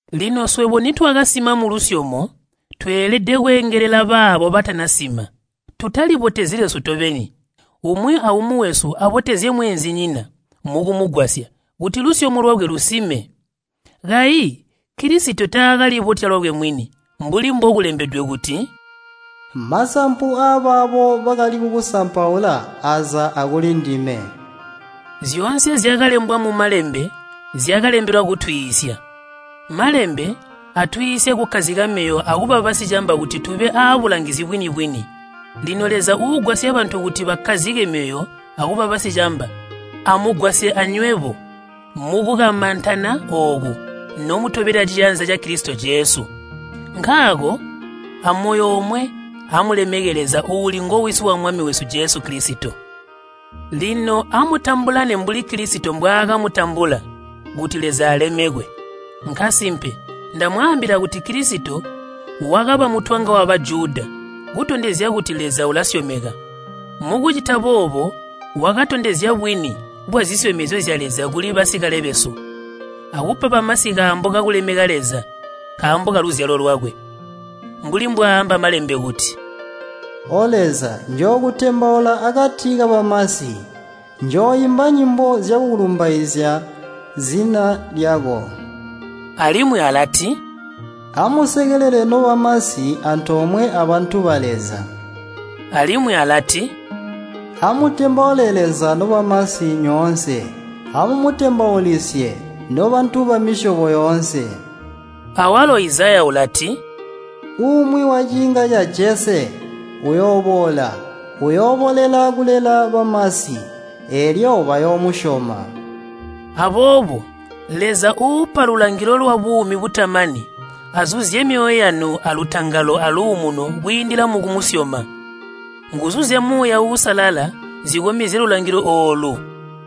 Lino swebo nitwakasima mulusyomo, tweelede kweengelela baabo batanasima. Tutalibotezyi lwesu tobeni. Umwi aumwi wesu abotezye mweenzinyina mukumugwasya kuti lusyomo lwakwe lusime. Kayi Kilisito taakalibotya lwakwe mwini, mbuli mbokulembedwe kuti, “Masampu aabaabo bakali kukusampaula aza akulindime.” Zyoonse zyakalembwa mu Malembe zyakalembelwa kutwiisya. Malembe atwiisya kukkazika myoyo akuba basicamba kuti tube aabulangizi bwini-bwini. Lino Leza uugwasya bantu kuti bakkazike myoyo akuba basicamba, amugwasye anywebo mukukamantana ooku nomutobela ciyanza ca Kilisito Jesu. Nkaako amoyo omwe amulemeke Leza uuli ngo Wisi wa Mwami wesu Jesu Kilisito. Lino amutambulane mbuli Kilisito mbwaakamutambula kuti Leza alemekwe. Nkasimpe ndamwaambila kuti Kilisito wakaba mutwanga wa Bajuda kutondezya kuti Leza ulasyomeka. Mukucita boobo wakatondezya bwini bwazisyomezyo zya Leza kuli basikale besu, akupa bamasi kaambo kakulemeka Leza nkaambo kaluzyalo lwakwe. Mbuli mbwaaamba Malembe kuti, “O Leza, njookutembaula akati kabamasi, njooimba nyimbo zyakulumbaizya zina lyako.” Alimwi alati, “Amusekelele nobamasi antoomwe abantu ba Leza.” Alimwi alati, “Amutembaule Leza nobamasi nyoonse, amumutembaulisye, nobantu bamisyobo yoonse.” Awalo Izaya ulati, “Umwi waciinga ca Jese uyooboola, uyooboolela kulela bamasi, eelyo bayoomusyoma.” Aboobo Leza uupa lulangilo lwabuumi butamani azuzye myoyo yanu alutangalo aluumuno kwiindila mukumusyoma. Nguzu zya Muuya Uusalala zikomezye lulangilo oolu.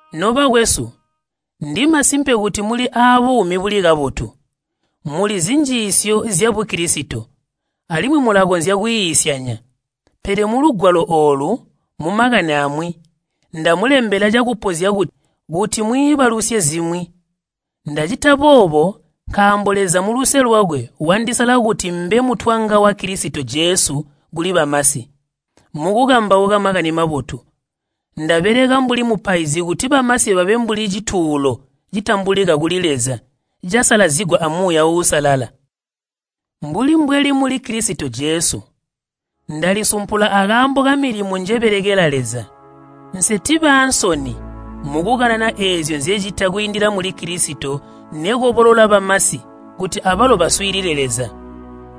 Nobakwesu, ndimasimpe kuti muli aabuumi buli kabotu, mulizi njiisyo zya Bukilisito, alimwi mulakonzya kwiisyanya. Pele mulugwalo oolu, mumakani amwi, ndamulembela cakupozya kuti mwiibalusye zimwi. Ndacita boobo nkaambo Leza muluse lwakwe wandisala kuti mbe mutwanga wa Kilisito Jesu kuli bamasi. Mukukambauka Makani Mabotu, ndabeleka mbuli mupaizi kuti bamasi babe mbuli cituulo citambulika kuli Leza casalazigwa a Muuya Uusalala. Mbuli mbweli muli Kilisito Jesu, ndalisumpula akaambo kamilimo njebelekela Leza. Nsitibe aansoni mukukanana eezyo nzecita kwiindila muli Kilisito nekobolola bamasi kuti abalo baswiilile Leza.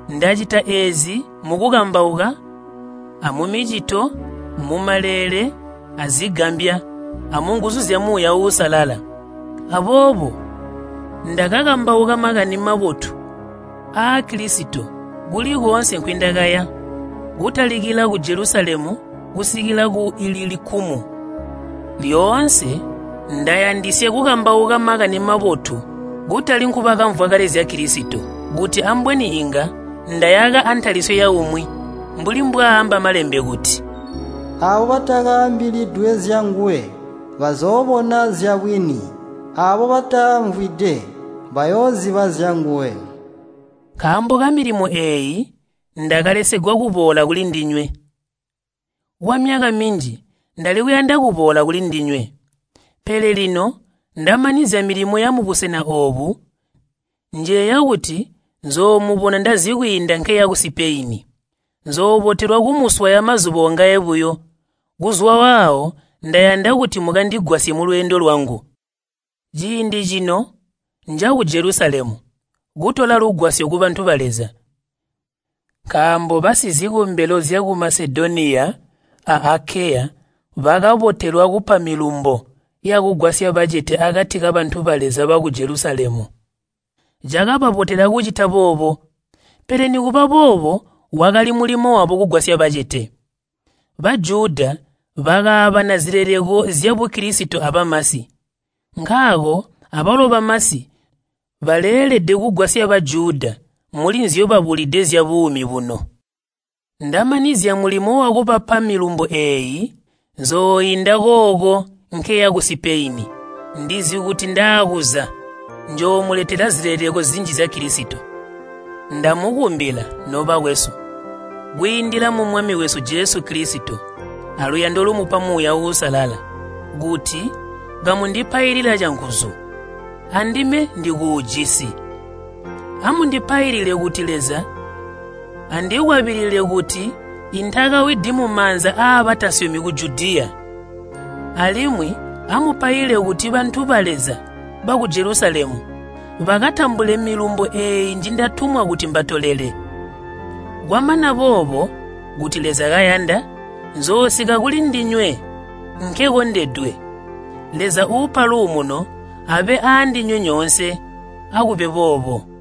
Ndacita eezi mukukambauka, amumicito, mumaleele azigambya, amunguzu zya Muuya Uusalala. Aboobo ndakakambauka Makani Mabotu aa Kilisito kuli koonse nkwindakaya, kutalikila ku Jelusalemu kusikila ku Ililikumu. Lyoonse ndayandisya kukambauka Makani Mabotu kutali nkubakamvwa kale zya Kilisito, kuti ambweni inga ndayaka antalisyo yaumwi. Mbuli mbwaamba Malembe kuti, “Aabo batakaambilidwe zyanguwe, bazoobona zyabwini, aabo batamvwide, bayooziba zyanguwe.” Nkaambo kamilimo eeyi ndakalesegwa kuboola kulindinywe. Kwamyaka minji ndali kuyanda kuboola kulindinywe. Pele lino ndamanizya milimo yamubusena oobu, njeeya kuti nzoomubona ndazikwiinda nkeya ku Sipeyini. Nzoobotelwa kumuswaya mazuba ongaye buyo, kuzwa waawo ndayanda kuti mukandigwasye mulweendo lwangu. Ciindi cino nja ku Jelusalemu, kutola lugwasyo kubantu ba Leza. Nkaambo basizikombelo zyaku Masedoniya a Akeya bakabotelwa kupa milumbo yakugwasya bacete akati kabantu ba Leza baku Jelusalemu. Cakababotela kucita boobo, pele nikuba boobo wakali mulimo wabo kugwasya bacete. Bajuda bakaabana zileleko zya Bukilisito abamasi, nkaako abalo bamasi baleelede kugwasya Bajuda muli nzyobabulide zyabuumi buno. Ndamanizya mulimo wakubapa milumbo eeyi, nzooinda kooko nkeya ku Sipeyini. Ndizi kuti ndaakuza, njoomuletelela zileleko zinji zya Kilisito. Ndamukumbila, nobakwesu, kwiindila mu Mwami wesu Jesu Kilisito aluyando lumupa Muuya Uusalala, kuti kamundipailila canguzu. Andime ndikuujisi. Amundipailile kuti Leza andikwabilile kuti intakawidi mumaanza abatasyomi ku Judiya. Alimwi amupaile kuti bantu ba Leza baku Jelusalemu bakatambule milumbo eeyi njindatumwa kuti mbatolele. Kwamana boobo, kuti Leza kayanda, nzoosika kulindinywe nkekondedwe. Leza uupa luumuno abe aandinywe nyoonse. Akube boobo.